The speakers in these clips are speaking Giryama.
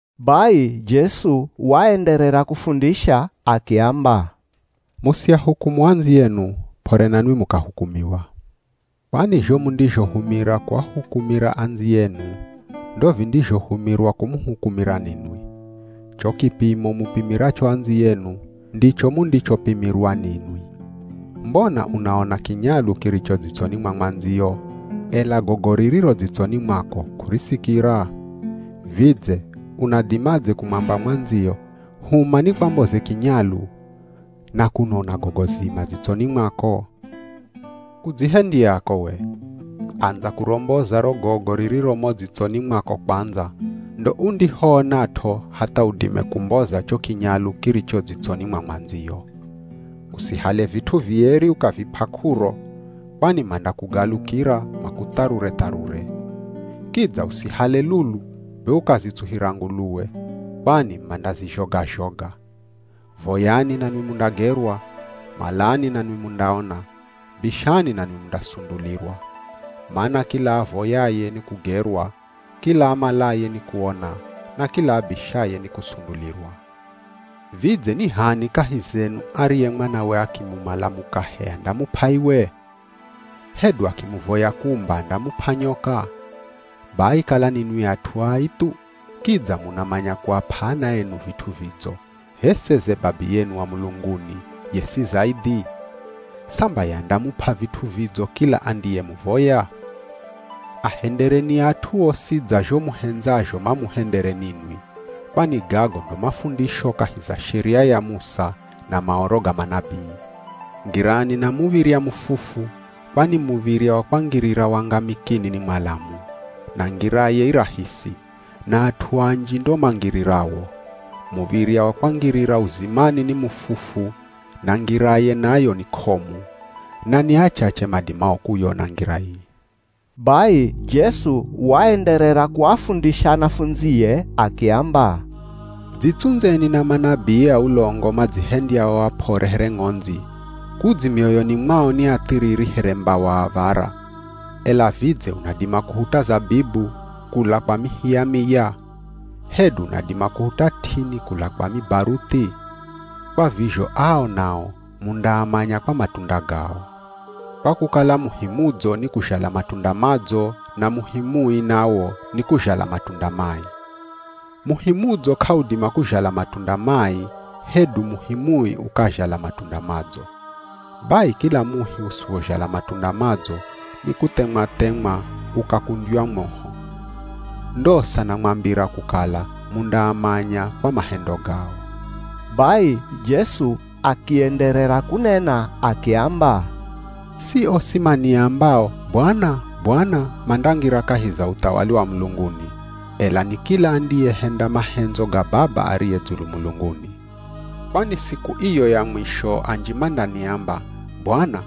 Bai Jesu waenderera kufundisha akiamba, “Musiahukumu andziyenu, p'ore nanwi mukahukumiwa. Kwani zho mundizhohumira kuahukumira andziyenu, ndo vindizhohumirwa kumuhukumira ninwi. Cho kipimo mupimiracho andziyenu, ndicho mundichopimirwa ninwi. Mbona unaona kinyalu kiricho dzitsoni mwa mwandziyo, ela gogo ririro dzitsoni mwako k'urisikira? Vidze, unadimadze kumwamba mwandziyo ‘Huma nikwamboze kinyalu,’ na kuno una gogo zima dzitsoni mwako? Kudzihendyako we! Andza kuromboza ro gogo ririro mo dzitsoni mwako kwandza, ndo undihoonat'o hatha udime kumboza cho kinyalu kiricho dzitsoni mwa mwandziyo.” “Usihale vit'u vieri ukavip'a k'uro, kwani mandakugalukira makutharure-tharure. Kidza usihale lulu be ukazitsuhira nguluwe, kwani mandazizhoga-zhoga.” “Voyani nanwi mundagerwa, malani nanwi mundaona, bishani nanwi mundasundulirwa. Mana kila avoyaye, nikugerwa; kila amalaye, nikuona; na kila abishaye nikusundulirwa. Vidze ni h'ani kahi zenu ariye mwanawe akimumala mukahe andamup'a iwe? Hedu akimuvoya kumba andamup'a nyoka? Bai kala ninwi at'u ai thu, kidza munamanya kuap'a ana enu vit'u vidzo, h'e seze Babiyenu wa mulunguni, ye si zaidhi? Samba ye andamup'a vit'u vidzo kila andiyemuvoya.” “Ahendereni at'u osi dza zho muhendzazho mamuhendere ninwi, kwani gago ndo mafundisho kahi za Sheria ya Musa, na Maoro ga manabii.” “Ngirani na muv̱irya mufufu, kwani muv̱irya wa kwangirira wangamikini ni mwalamu, na ngiraye i rahisi, na at'u anji ndo mangirirawo. Muv̱irya wa kwangirira uzimani ni mufufu na ngiraye nayo ni k'omu, na ni achache madimao kuyona ngira ii.” Bai Jesu waenderera kuafundisha anafundzie akiamba, “Dzitsundzeni na manabii a ulongo madzihendyao ap'ore here ng'ondzi, kudzi mioyoni mwao ni athiriri here mbawa av̱ara. Ela vidze unadima kuhuta zabibu, kula kwa mihi ya miya? Hedu unadima kuhuta t'ini kula kwa mibaruthi? Kwa vizho ao nao mundaamanya kwa matunda gao, kwa kukala muhi mudzo nikuzhala matunda madzo, na muhi mui nawo, nikuzhala matunda mai. Muhi mudzo k'audima kuzhala matunda mai, hedu muhi mui ukazhala matunda madzo. Bai kila muhi usiwozhala matunda madzo, nikuthemwa-themwa ukakundywa moho. Ndosa namwambira kukala mundaamanya kwa mahendo gao.” Bai Jesu akienderera kunena akiamba, “Si osi maniambao, ‘Bwana! Bwana!’ mandangira kahi za uthawali wa mulunguni, ela ni kila andiyehenda mahendzo ga Baba ariye dzulu mulunguni. Kwani siku iyo ya mwisho anji mandaniamba, ‘Bwana,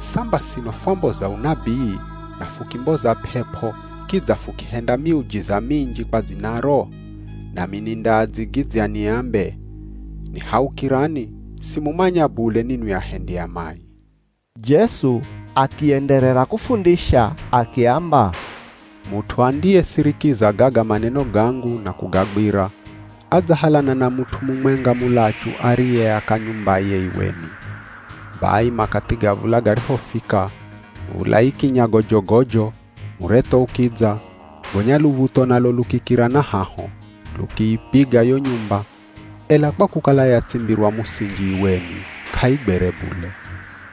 samba sino fwamboza unabii, na fukimboza p'ep'o kidza fukihenda miujiza minji kwa dzinaro?’ Nami nindaadzigidzya niambe, ‘Nihaukirani, simumanya bule ninwi ahendi a mai.’” Jesu akienderera kufundisha akiamba, “Mut'u andiyesirikiza gaga maneno gangu na kugagwira, adzahalana na mut'u mumwenga mulachu ariyeaka nyumbaye iweni. Bai makathi ga v̱ula garihofika, v̱ula ikinya gojogojo, muretho ukidza, gonya luv̱utho nalo lukikira na haho, lukiipiga yo nyumba, ela kwa kukala yatsimbirwa musinji iweni k'aigwere bule.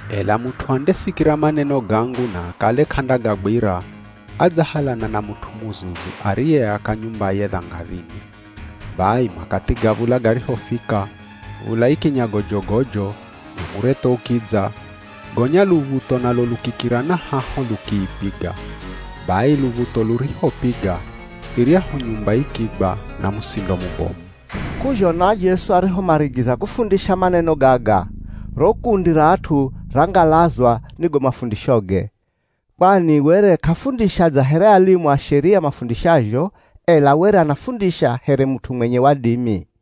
Ela mut'u andesikira maneno gangu na akale k'andagagwira, adzahalana na mut'u muzuzu ariyeaka nyumbaye dhangadhini. Bai makathi ga v̱ula garihofika, v̱ula ikinya gojogojo, na muretho ukidza, gonya luv̱utho nalo lukikira na haho lukiipiga. Bai luv̱utho lurihopiga, iryahu nyumba ikigwa na musindo mubomu.” K'uzhona Jesu arihomarigiza kufundisha maneno gaga, ro kundi ra at'u rangalazwa ni go mafundishoge, kwani were k'afundisha dza here alimu a Sheria mafundishazho, ela were anafundisha here mut'u mwenye wadimi.